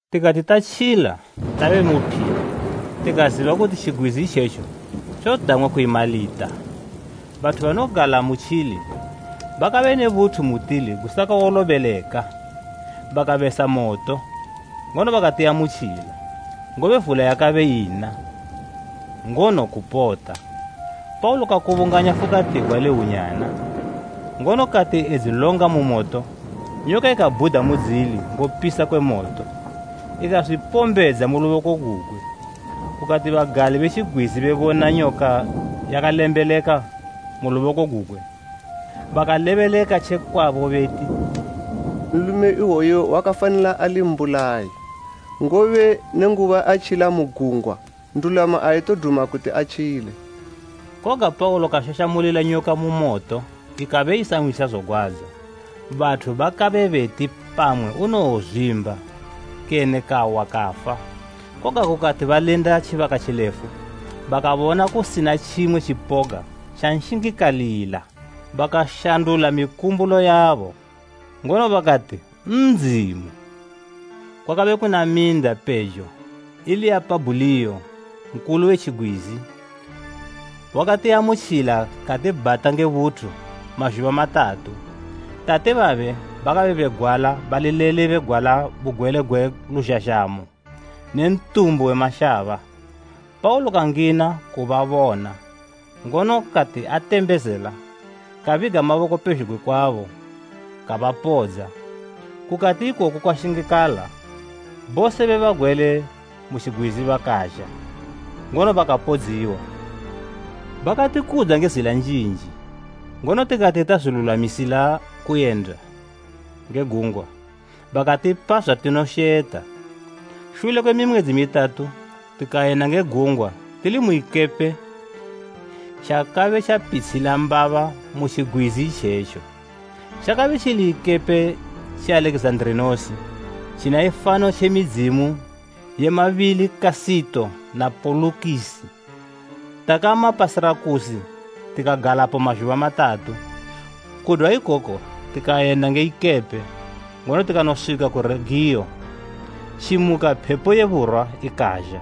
Tikati tatjila tabe mu phili tikaziba kuti tjigwizi itjetjo tjodang'wa kuyi Malita. Bathu banogala mutjili bakabe ne buthu mutili gusakawolobeleka. Bakabesa moto, ngono bakatiamutjila, ngobe vula yakabe ina, ngono kupota. Paulo kakubunganya fukatigwa le hwunyana, ngono kati edzilonga mu moto nyoka ikabhuda mudzili ngopisa kwe moto, ikazwipombedza mu luboko gugwe. Kukati bagali be tjigwizi bebona nyoka yakalembeleka mu luboko gugwe, bakalebeleka tje kwabo beti, “Nlume iwoyu wakafanila ali mbulayi; ngobe nenguba atjila mu gungwa, ndulamo aitoduma kuti atjile.” Koga Paulo kashashamulila nyoka mu moto, ikabe isanhwisa zogwadza. Bathu bakabe beti pamwe unowozwimba kene kawa kafa, koga kukati balinda tjibaka tjilefu bakabona kusina tjimwe tjipoga tjanshingikalila, bakashandula mikumbulo yabo, ngono bakati ndzimu! Kwakabe kuna minda pejo ili ya Pabhuliyo, nkulu we tjigwizi. Wakatiamutjila katibhata nge buthu mazhuba matatu. Tate babe bakabe begwala bali lele begwala bugwele gwe luzhazhamo ne ntumbu we mashaba. Paulo kangina kubabona ngono kati atembezela kabiga maboko pezhugwi kwabo kabapodza. Kukati ikoku kwashingikala bose be bagwele mu tjigwizi bakazha, ngono bakapodziwa. Bakatikudza nge zila njinji, ngono tikati tazwilulwamisila kuyenda nge gungwa, bakatipa zwatinosheta. Shule kwe mimwedzi mitatu tikayenda nge gungwa tili mu ikepe tjakabe tjapitshila mbaba mu tjigwizi itjetjo. Tjakabe tjili ikepe tje Alekizanda tjina ifano tje midzimu ye “Mabili Kasito na Polukisi.” Takama pa Sirakusi tikagalapo mazhuba matatu. Kudwa ikoko tikayenda nge ikepe, ngono tikanoswika ku Regiyo. Tjimuka phepo ye burwa ikazha,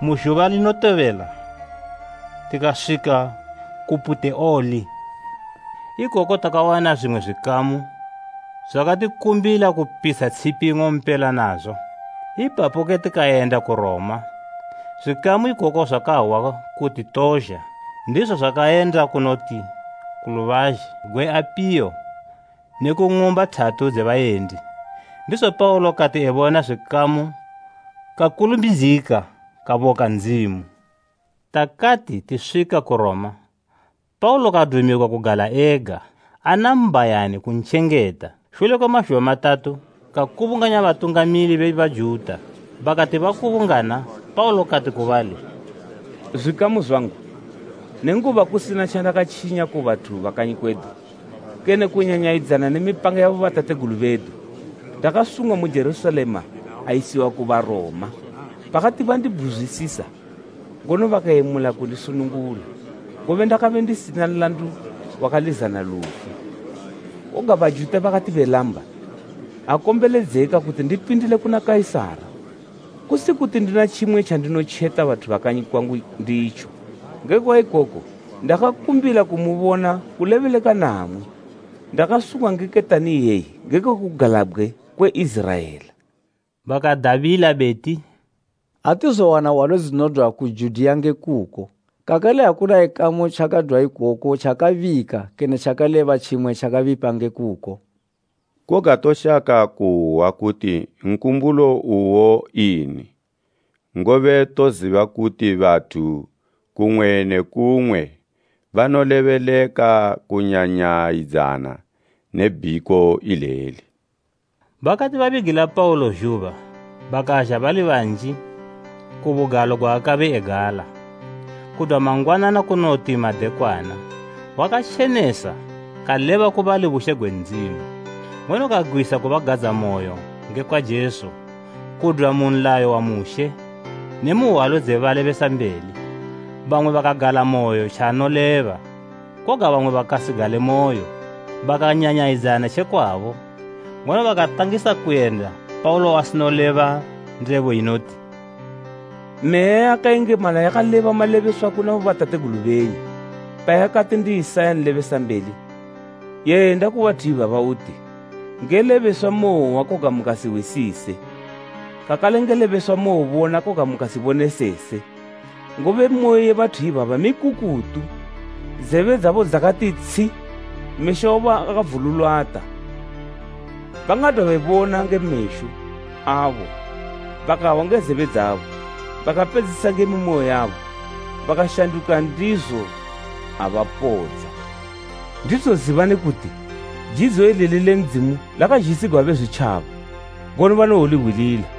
mu zhuba linotobela tikaswika ku Puteoli. Ikoko takawana zwimwe zwikamu zwakatikumbila kupitsha tshipi ing'ompela nazo. Ipapoke tikayenda ku Roma. Zwikamu ikoko zwakahwa kuti tozha. Ndizo zwakayenda kunoti ku Lubazhe gwe Apiyo ne ku Ng'umba thatu dze Bayendi. Ndizo Paulo kati ebona zwikamu kakulumbidzika kaboka Ndzimu. Takati tiswika ku Roma, Paulo kadumigwa kugala ega, ana mbhayani kuntjengeta. Shule kwe mazhuba matatu kakubunganya batungamili be Bajuta. Bakati bakubungana Paulo kati ku bali, “Zwikamu zwangu, nenguba kusina tjandakatjinya ku bathu ba kanyi kwedu kene kunyanyayidzana ne mipanga yabo batategulu bedu, ndakasungwa mu Jerusalema ayisiwa ku Baroma. Bakati bandibhuzwisisa, ngono bakayemula kundisunungula, ngobe ndakabe ndisina nlandu wakalizana lufu. Koga Bajuta bakati belamba, akombeledzeka kuti ndipindile kuna Kaisara kusi kuti ndina tjimwe tjandinotjeta bathu ba kanyi kwangu nditjo. Ngekwa ikoku ndakumbila kumubona kulebeleka namwi. Ndakasungwa nge ketani iyeyi ngekwe kugalabgwe kwe Iziraela.” Bakadabila beti, “Atizowana hwalo dzinodwa ku Judiya nge kuko kakale akuna ikamu tjakadwa ikoko tjakabika kene tjikaleba tjimwe tjakabipa nge kuko. Koga toshaka kuhwa kuti nkumbulo uwo ini, ngobe toziba kuti bathu kumwe ne kumwe banolebeleka kunyanyayidzana ne bhiko ileli.” Bakati babigila Paulo zhuba bakazha bali banji ku bugalo gwaakabe egala. Kudwa mangwanana kunoti madekwana, wakatjenesa kaleba ku bali bushe gwe Ndzimu, ngono kagwisa kubagadzamoyo ngekwa Jesu kudwa mu nlayo wa Mushe ne mu hwalo dze balebesambeli. Bamwe bakagalamoyo tjaanoleba koga bamwe bakasigalemoyo. Bakanyanyayidzana tje kwabo, ngono bakatangisa kuyenda Paulo asinoleba ndebo inoti: “Meya yakayengemala yakaleba malebeswa kuna bobatategulu benyu payakati ndi Isaya nlebesambeli, “ ‘Yenda ku bathu ibaba uti: Nge lebeswa mowohwa koga mukasihwisise, kakale nge lebeswa mowobona koga mukasibonesese, ngobe moyo ye bathu ibaba mikukutu; zebe dzabo dzakati tshi, mesho abo akavululata. Bangadwa bebona nge mesho abo, bakahwa nge zebe dzabo bakapedzisisa nge mimoyo yabo bakashanduka ndizo abapodza.’ “Ndizo zibani kuti jidzo ileli le Ndzimu lakazhisigwa Bezwitjaba, ngono banowohwilila!” [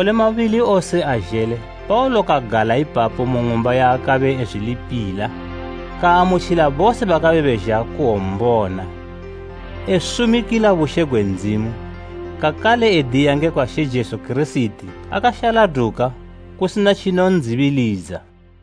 Makole mabili wose azhele Paulo kagala ipapo mu ng'umba yaakabe ezwilipila, kaamutjila bose bakabe bezha kuwombona, esumikila bushe gwe Ndzimu kakale ediya ngekwa She Jesu Kirisiti akashaladuka kusina tjinondzibilidza.